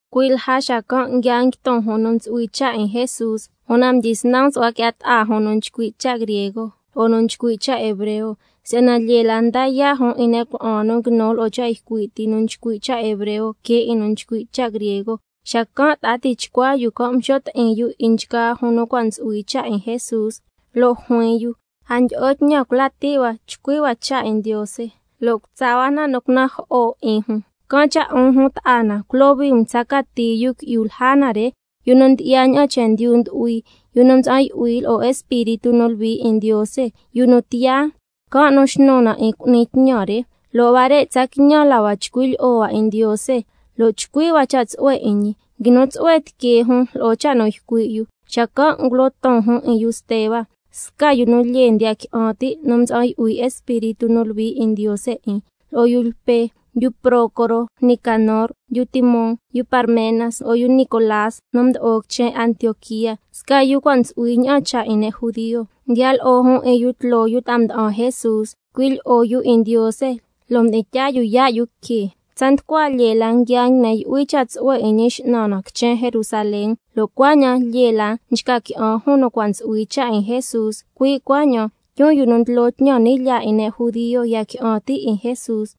Cui' lja xacan' nguia nguiton jun nu ntsu'hui cha' 'in Jesús, una mdyisnan msu'hua qui'ya ta'a jun nu nchcui' cha' griego lo'o nu nchcui' cha' hebreo, si'yana lyee la nda yaa' jun 'in ne' cuna'an nu nguinu lo'o cha' ycui' ti nu nchcui' cha' hebreo que 'in nu nchcui' cha' griego. Xacan' ta'a tichcua yu can' mxo' ti'in yu 'in nchgaa jun nu cua' ntsu'hui cha' 'in Jesús, lo' juin yu: A ndyi'o tñan cula' ti' hua chcui' hua cha' 'in Ndiose, lo' cutsa hua na nu cunajo'o 'in jun. Can' cha', 'un jun ta'a na, culohui um tsa cati yu qui'yu lja na re, yu nu ndyi'ya ña'an chendyu ndu'hui, yu nu mtsa'an yu'hui lo'o Espíritu nu Luhui 'in Ndiose, yu nu tiyaa, can' nu xnu na 'in cu'ni tñan re. Lo' huare' tsa quiñan la hua chcui' lyi'o hua 'in Ndiose lo' chcui' hua cha' tsu'hue 'in ñi. Nguinu tsu'hue tiquee jun lo'o cha' nu ycui' yu. Xacan' ngulo ton jun 'in yu Steba, sca yu nu lyee ndiya qui'an ti' nu mtsa'an yu'hui Espíritu nu Luhui 'in Ndiose 'in, lo'o yu Lpe, yu Prócoro, Nicanor, yu Timón, yu Parmenas, lo'o yu Nicolás nu mdo'o quichen Antioquía, sca yu cua' ntsu'hui ña'an cha' 'in ne' judio. Mdiya lo'o jun 'in yu tloo yu ta'a mda'an Jesús, ycui' lyi'o yu 'in Ndiose, lo' mdi'in tyaa yu yaa' yu que. Tsa nducua lyee la nguia nguine yu'hui cha' tsu'hue 'in Ñi X'nan na quichen Jerusalén, lo' cuaña'an lyee la nchca qui'an jun nu cua' ntsu'hui cha' 'in Jesús, cui' cuaña'an tyun yu nu ndlo tñan ni' lyaa 'in ne' judio ya qui'an ti' 'in Jesús.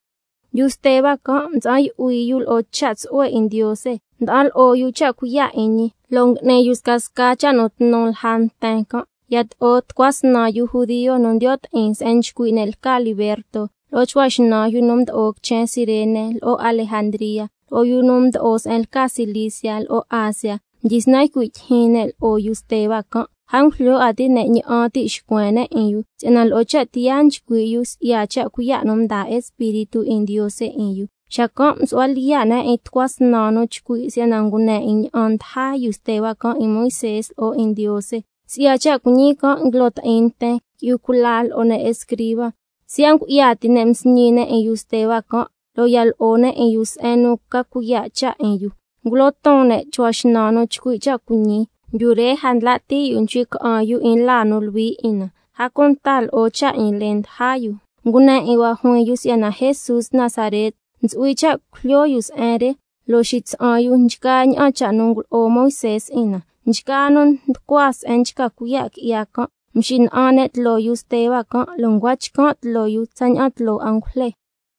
Yu Steba can' mtsa'an yu'hui yu lo'o cha' tsu'hue 'in Ndiose, nda'an lo'o yu cha' cuiya' 'in ñi, can' cha' ngui'ni yu scasca cha' nu tnu tloo nten can'. Yato'o tucua snan yu judio nu ndiyo' ti'in se'en nchcui' ne' lca Liberto, lo'o chcua xnan yu nu mdo'o quichen Cirene lo'o Alejandría, lo'o yu nu mdo'o se'en lca Cilicia lo'o Asia, mdyisnan ycui' tyijyin ne' lo'o yu Steba can'. A ngujlyo 'a ti' ne' ña'an ti' xcuen ne' 'in yu, si'yana lo'o cha' tiyaa nchcui' yu si'ya cha' cuiya' nu mdaa Espíritu 'in Ndiose 'in yu. Xacan' msu'hua lyiya' ne' 'in tucua snan nu chcui' si'yana ngune 'in ña'an mdaja yu Steba can' 'in Moisé lo'o 'in Ndiose. Si'ya cha' cuiñi can' nguilo ti'in nten, qui'yu cula lo'o ne' escriba. Siya' ngu'ya ti ne' msñi ne' 'in yu Steba can', lo' ya lo'o ne' 'in yu se'en nu ntsu'hui cha' ca cuiya' cha' 'in yu. Ngulo ton ne' chcua xnan nu chcui' cha' cuiñi: Yu re a ndla' ti' yu nchcui' ca'an yu 'in laa nu luhui 'in na, a cunta lo'o cha' 'in lee ndaja yu. Ngune 'in hua juin yu si'yana Jesús Nazaret ntsu'hui cha' cujlyo yu se'en re, lo' xitsa'an yu nchgaa ña'an cha' nu ngulo'o Moisé 'in na. Nchgaa nu nducua se'en nchca cuiya' qui'ya can', mxina'an ne' tloo yu Steba can', lo' ncua chcan' tloo yu tsaña'an tloo angujle.